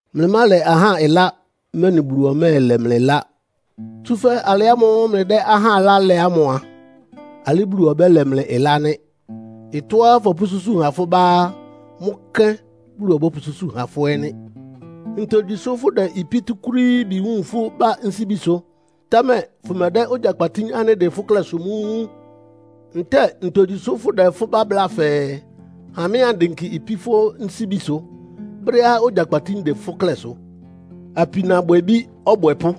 “Mlɩmálɛ ahá ɩlá, mɛ́nɩ Bulu ɔmɛ́ɛlɛ mlɩ ɩlá. Tsúfɛ́ alɩ ámʋ́ʋ́ mlɩdɛ́ ahá ɩlá lɛ ámʋ a, alɩ Bulu ɔbɛ́lɛ mlɩ ɩlá nɩ́. Ɩtɔ́á fɔpʋ́súsu ha fʋ́ bá á, mʋ́ kɛ́n Bulu ɔbɔ́pʋsúsu ha fʋ́ ɛ́ nɩ́. Ntogyi sʋ́ fʋ́dɛ ipí túkúrííbi wun fʋ́ bá nsíbisʋ, támɛ fʋmɛdɛ́ ogyakpatín ánɩ́ ɩdɩn fʋ́ klɛ́sʋ mʋ́ wun? Ntɛ́ɛ ntogyi sʋ́ fʋ́dɛ fʋ́ bá bláa fɛɛ, ‘Ha mɩ́ andɩnkɩ ipí fʋ́ nsíbisʋ?’ brɛ́á ogyakpatín dɩn fʋ́ klɛ́sʋ? Apinabwɛbí ɔbwɛpʋ́!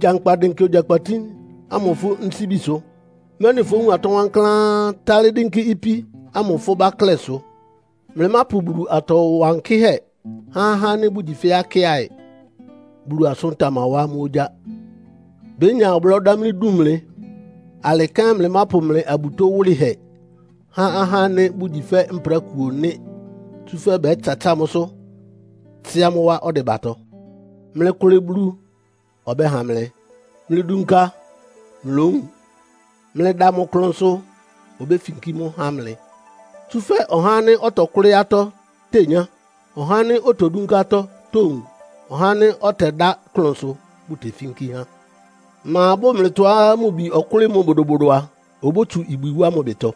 Gyankpa dɩnkɩ ogyakpatín ámʋ fʋ́ nsíbisʋ, mɛ́nɩ fówun atɔ́ wankláán, tálɩ́ dɩ́nkɩ́ ipí ámʋ fʋ́ bá klɛ́sʋ. “Mlɩmápʋ Bulu atɔ wankɩ́hɛ́ há ahá ánɩ́ bʋgyi fɛ́ akɩ́aɩ, Bulu asʋ́n tamawá amʋ́ ogyá. Bénya ɔblɔ́ dámlí dun mlɩ. Alɩ kɛ́n mlɩmápʋ mlɩ abutó wʋlɩhɛ há ahá ánɩ́ bʋgyi fɛ́ mprákuo nɩ́. Tsúfɛ́ bɛ́tsatsáa mʋ́sʋ́, tsɩ́á mʋ́ wá ɔdɩbatɔ. “Mlɩkʋlɩ Bulu, ɔbɛ́ha mlɩ. Mlɩdunka, mlówun. Mlɩda mʋ klʋnsʋ, obéfinkí mʋ́ há mlɩ. Tsúfɛ́ ɔhá ánɩ́ ɔtɔkʋ́lɩ́ atɔ́ tenyá. Ɔhá ánɩ́ otodúnká atɔ́ towun. Ɔhá ánɩ́ ɔtɛdá klʋnsʋ bʋ́tefínkí há. Ma bʋ́ʋ mlɩtɔá mʋ bi ɔkʋ́lɩ́ mʋ bodobodo a, obótsu ibwi wá mʋ ɩbɩtɔ?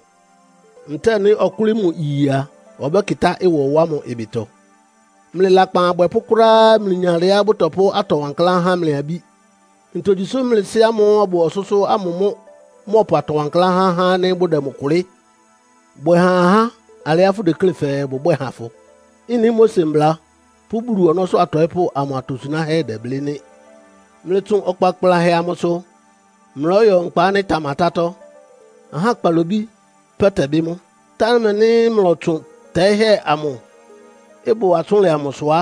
Ntɛ́ɛ nɩ́ ɔkʋ́lɩ́ mʋ iye a, ɔbɛ́kɩtá ɩwɔ wá mʋ ɩbɩtɔ? Mlɩ lakpan abwɛpʋ́ kʋ́ráá mlɩyin alɩá bʋtɔpʋ́ atɔ wankláán há mlɩ abí. Ntogyi sʋ́ mlɩ Sɩ́ ámʋ́ʋ́ ɔbʋ ɔsʋ́sʋ́ ámʋ mʋ́ mɔ́ɔpʋ atɔ wankláán há ahá ánɩ́ bʋdɛ mʋ kʋlɩ́. “Bwɛ ha ahá alɩá fʋdeklé fɛɛ bʋbwɛ́ɛ ha fʋ. Ɩ́nɩ Mose Mbla pʋ́ Bulu ɔnɔ́sʋ́ atɔɩ́pʋ́ amʋ atosunáhɛ́ dɛblɩ́ nɩ́. “Mlɩtsʋn ɔkpa kplanhɛ amʋsʋ, mlɔ́yɔ nkpa ánɩ́ ɩtamatátɔ́. Ahá kpalobí pɛ́ tɛbɩ́ mʋ́. Támɛ nɩ́ mlɔtsʋn tɛ́ɩ́hɛ́ ámʋ́ʋ́ ɩbʋ atsʋ́nlɛ amʋsʋ á,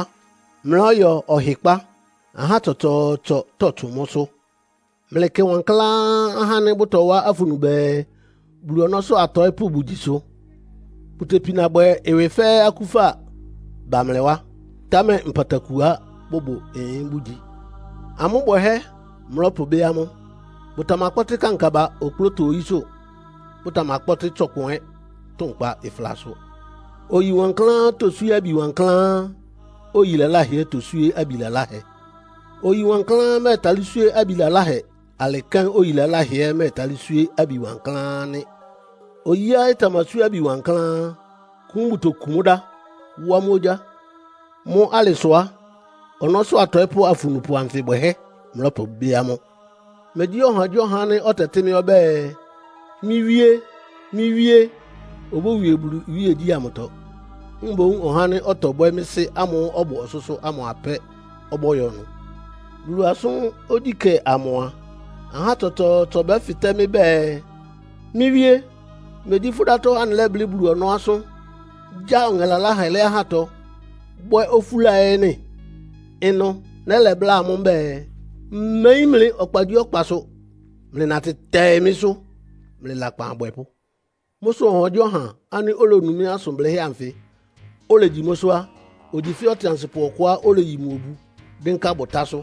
mlɔ́yɔ ɔhɩkpá. Ahá tsɔtsɔɔtsɔ tɔ́tsʋn mʋ́sʋ́. “Mlɩkɩ wankláán ahá ánɩ́ bʋtɔwá afunu bɛɛ, Bulu ɔnɔ́sʋ́ atɔɩ́pʋ́ bʋgyisʋ. Bʋtepina bwɛ ɩwɩ fɛ́ akúfa ba mlɩ wá, támɛ nkpatakuá bʋbʋ ɩyɩn bʋ́gyi. Amʋ́ bwɛhɛ́ mlɔ́pʋbɩ́ amʋ́. Bʋtamakpɔ́tɩ́ kankaba okplóto oyísʋ́, bʋtamakpɔ́tɩ́ tsɔkpʋn ɛ́ tʋnkpa ɩflasʋ. Oyi wankláán toswíé abi wankláán. Oyi laláhɛ ɛ́ toswíé abi laláhɛ. Oyi wankláán mɛ́ɛtalɩ́ swíé abi laláhɛ. Alɩ kɛ́n oyi laláhɛ ɛ́ mɛ́ɛtalɩ́ swíé abi wankláán nɩ́. Oyíá ɩtamaswíé abi wankláán á, kún bʋtokun mʋ́ dá, wá mʋ́ ogyá. Mʋ́ alɩ sʋ á, ɔnɔ́sʋ́ atɔɩ́pʋ́ afunupʋ anfɩ bwɛhɛ́ mlɔ́pʋbɩ́ amʋ́. “Megyí ɔhagyíɔha ánɩ́ ɔtɛtɩ́ mɩ́ ɔbɛ́ɛ, ‘Mɩ́ Wíé, mɩ́ Wíé’ obówie Bulu iwíegyí ámʋtɔ. Mboún ɔhá ánɩ́ ɔtɔbwɛ́ mɩ́ Sɩ́ ámʋ́ʋ́ ɔbʋ ɔsʋ́sʋ́ ámʋ apɛ́ ɔbɔ́yɔ ɩnʋ. Bulu asʋ́n ogyíkɛ́ amʋ a, ahá tsɔtsɔɔtsɔ bɛ́fɩtɛ́ mɩ́ bɛɛ, ‘Mɩ́ Wíé, megyí fʋ́ dátɔ́ anɩlɛ́blɩ́ Bulu ɔnɔ́ asʋ́n, gya ɔŋɛ laláhɛ lɛ́ ahátɔ, bwɛ́ ofúla ɛ́ nɩ́?’ Ɩnʋ nɛ́lɛ bláa amʋ́ mbɛ́ɛ, ‘Mmeyín mlɩ ɔkpagyíɔkpasʋ. Mlɩnatɩ tɛɩ mɩ́sʋ́, mlɩ lakpan abwɛpʋ́!’ “Mʋ́ sʋ ɔhagyíɔha ánɩ́ olonu mɩ́ asʋn blɩ́hɛ́ anfɩ, olegyi mʋ́sʋ́ á, ogyi fɛ́ ɔtɩansɩpʋ ɔkʋá oleyi mʋ obu dɩ́nká bʋtásʋ́.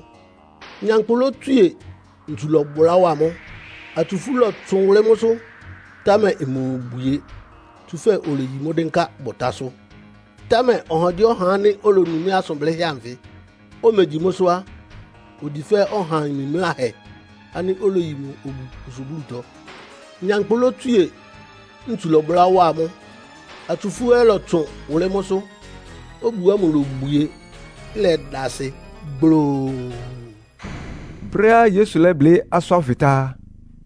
Nyankpʋ lótswíe, ntsu lɔ́bʋlá wa mʋ́, atsufú lɔtsʋn wʋlɩ́ mʋ́sʋ́, támɛ imobwie. Tsúfɛ́ oleyi mʋ́ dɩ́nká bʋtásʋ́. “Támɛ ɔhagyíɔha ánɩ́ olonu mɩ́ asʋn blɩ́hɛ́ anfɩ, omegyi mʋ́sʋ́ á, ogyi fɛ́ ɔha mimláhɛ ánɩ́ oleyi mʋ obu osublútɔ. Nyankpʋ lótswíe, ntsu lɔ́bʋlá wá mʋ́, atsufú ɛ́ lɔtsʋn wʋlɩ́ mʋ́sʋ́. Obu ámʋ lobwie, ɩlɛda asɩ gbloo!” Brɛ́á Yesu lɛ́blɩ́ asʋ́n ánfɩ tá á,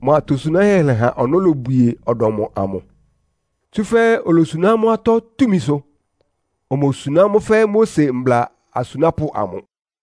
mʋ atosunáhɛ́ lɛha ɔnɔ́ lobwie ɔdɔm amʋ. Tsúfɛ́ olosuná amʋ́ atɔ́ túmisʋ. Omosuná mʋ́ fɛ́ Mose mbla asunápʋ́ amʋ.